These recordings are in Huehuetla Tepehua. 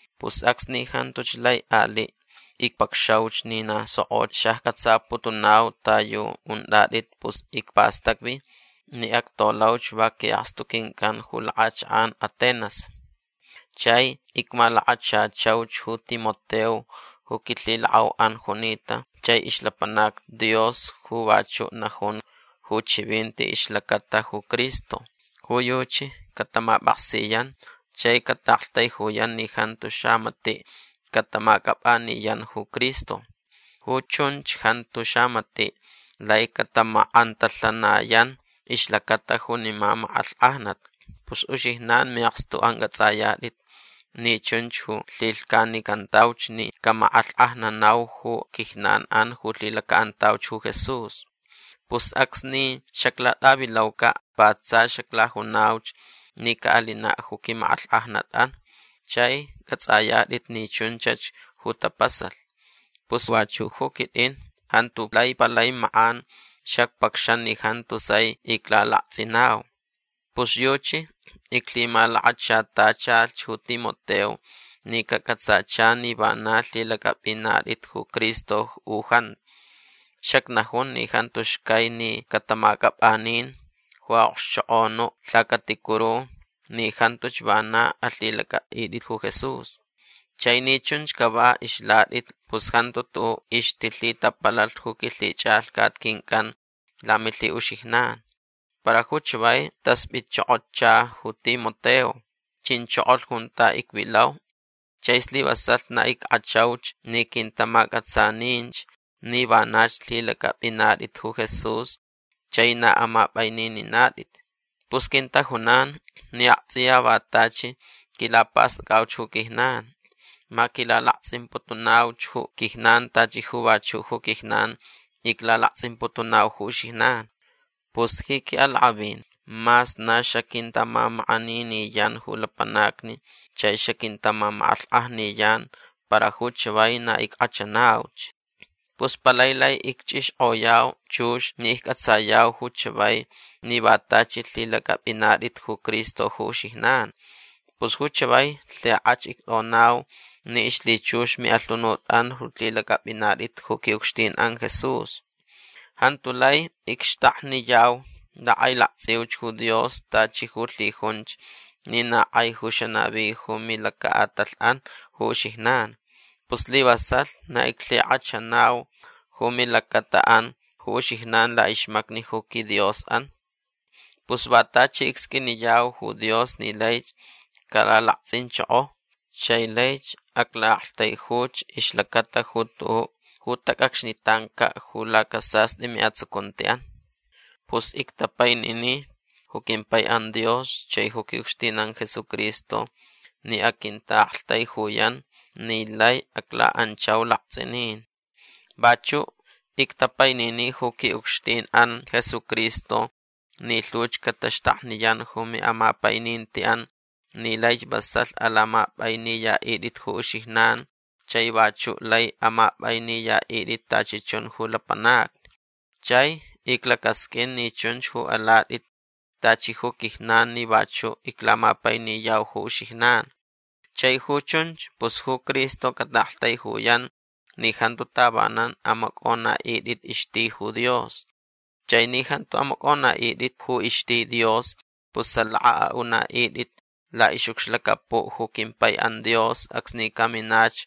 Pus acsni jantuch lai aliʼ icpacxauch ni na sokʼoch xaccʼatsaputunau ta yu untʼatʼit pus icpastacvi ni actolauch va quiʼakstu quincʼan ju lakʼachakʼan Atenas. Chai icmalakachachauch ju Timoteo ju quilhilakʼauʼan junita chai ixlapanac Dios ju vachuʼ najun ju chivinti ixlacata ju Cristo. Ju yuchi catamapʼaksiyan chai cataʼaktaijuyan ni jantu xamatiʼ catamacʼapʼaniyan ju Cristo. Ju chunch jantu xamatiʼ lai catamakʼantalhanayan ixlacata junima makʼalhkʼajnat. Pus uxijnan miʼakstuʼan cʼatsʼayatʼit ni chunch ju lhilhcanicantauch ni camakʼalhkʼajnanau ju quijnanʼan ju lhilacaʼantauch ju Jesús. Pus acsni xaclatʼavilaucaʼ va tsa xaclajunauch ni caʼalinaʼ ju quimakʼalhkʼajnatʼan. Chai cʼatsʼayatʼit ni chunchach ju tapasalh. Pus vachuʼ ju quitʼin jantu lai palai makʼan xacpacxan ni jantu sai iclalaktsʼinau. Pus yuchi iclhimalakachatachalh ju Timoteo ni cacʼatsacha ni vana lhilacʼapʼinatʼit ju Cristo u jantu. Xacnajun ni jantu xcai ni catamacʼapʼanin ju aʼokxchokʼonu lhacaticuru ni jantuch vana alhilacʼapʼitʼit ju Jesús. Chai ni chunch cava ixlatʼit pus jantu tuʼuʼ ixtilhitapalalh ju quilhichʼalhcat quincʼan lamilhiʼuxijnan. Para ju chavai taspʼitchokocha ju Timoteo. Chinchokolh junta icvilau chai slivasalh na ickʼachauch ni quintamacʼatsaninch ni vanach lhilacʼapʼinatʼit ju Jesús chai na amapʼainininatʼit. Pus quintajunan ni aktsʼiya va tachi quilapastʼacʼauch ju quijnan. Ma quilalaktsʼimputunauch ju quijnan tachi ju vachuʼ ju quijnan iclalaktsʼimputunau ju uxijnan. Pus ji quiʼalakʼavin mas na xaquintaʼamamakʼaniniyan ju lapanacni chai xaquintamamakʼalhkʼajniyan para ju chavai na ickʼachanauch. Pus palai lai icchʼixkʼoyau chux ni iccʼatsayau ju chavai ni va tachi lhilacʼapʼinatʼit ju Cristo ju uxijnan. Pus ju chavai lhikʼach ictʼonau ni ixlhichux miʼalhunutʼan ju lhilacʼapʼinatʼit ju quiʼucxtinʼan Jesús. Jantu lai icxtakniyau lakʼailaktsʼiuch ju Dios tachi ju lhijunch ni na kʼai ju xanavi ju milacaʼatalhʼan ju uxijnan. Pus slivasalh na iclhikʼachanau ju milacataʼan ju uxijnan laʼixmacni ju quiDiosʼan. Pus va tachi icsqʼuiniyau ju Dios ni laich calalaktsʼinchoko. Chai laich aclaʼaktaijuch ixlacata ju tuʼuʼ ju tacʼacxnitancaʼ ju lacasastʼi miʼatsucuntiʼan. Pus ictapainini ju quimpaiʼan Dios chai ju quiʼucxtinʼan Jesucristo ni aquintaʼaktaijuyan ni lai aclaʼanchau laktsʼinin. Vachuʼ ictapainini ju quiʼucxtinʼan Jesucristo ni lhuch cataxtakniyan ju miʼamapainintiʼan ni laich vasalh alamapʼainiyaʼitʼit ju uxijnan chai vachuʼ lai amapʼainiyaʼitʼit tachi chun ju lapanacni. Chai iclacasqʼuin ni chunch ju alatʼit tachi ju quijnan ni vachuʼ iclamapainiyau ju uxijnan. Chai ju chunch pus ju Cristo cataʼaktaijuyan ni jantu tavanan amacʼonaʼitʼit ixti ju Dios. Chai ni jantu amacʼonaʼitʼit ju ixti Dios pus salaka aʼunaʼitʼit laʼixʼucxlacapuʼ ju quimpaiʼan Dios acsni caminach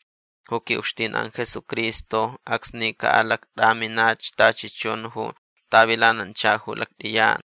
ju quiʼucxtinʼan Jesucristo acsni caʼalactʼaminach tachi chun ju tavilanancha ju lactʼiyan.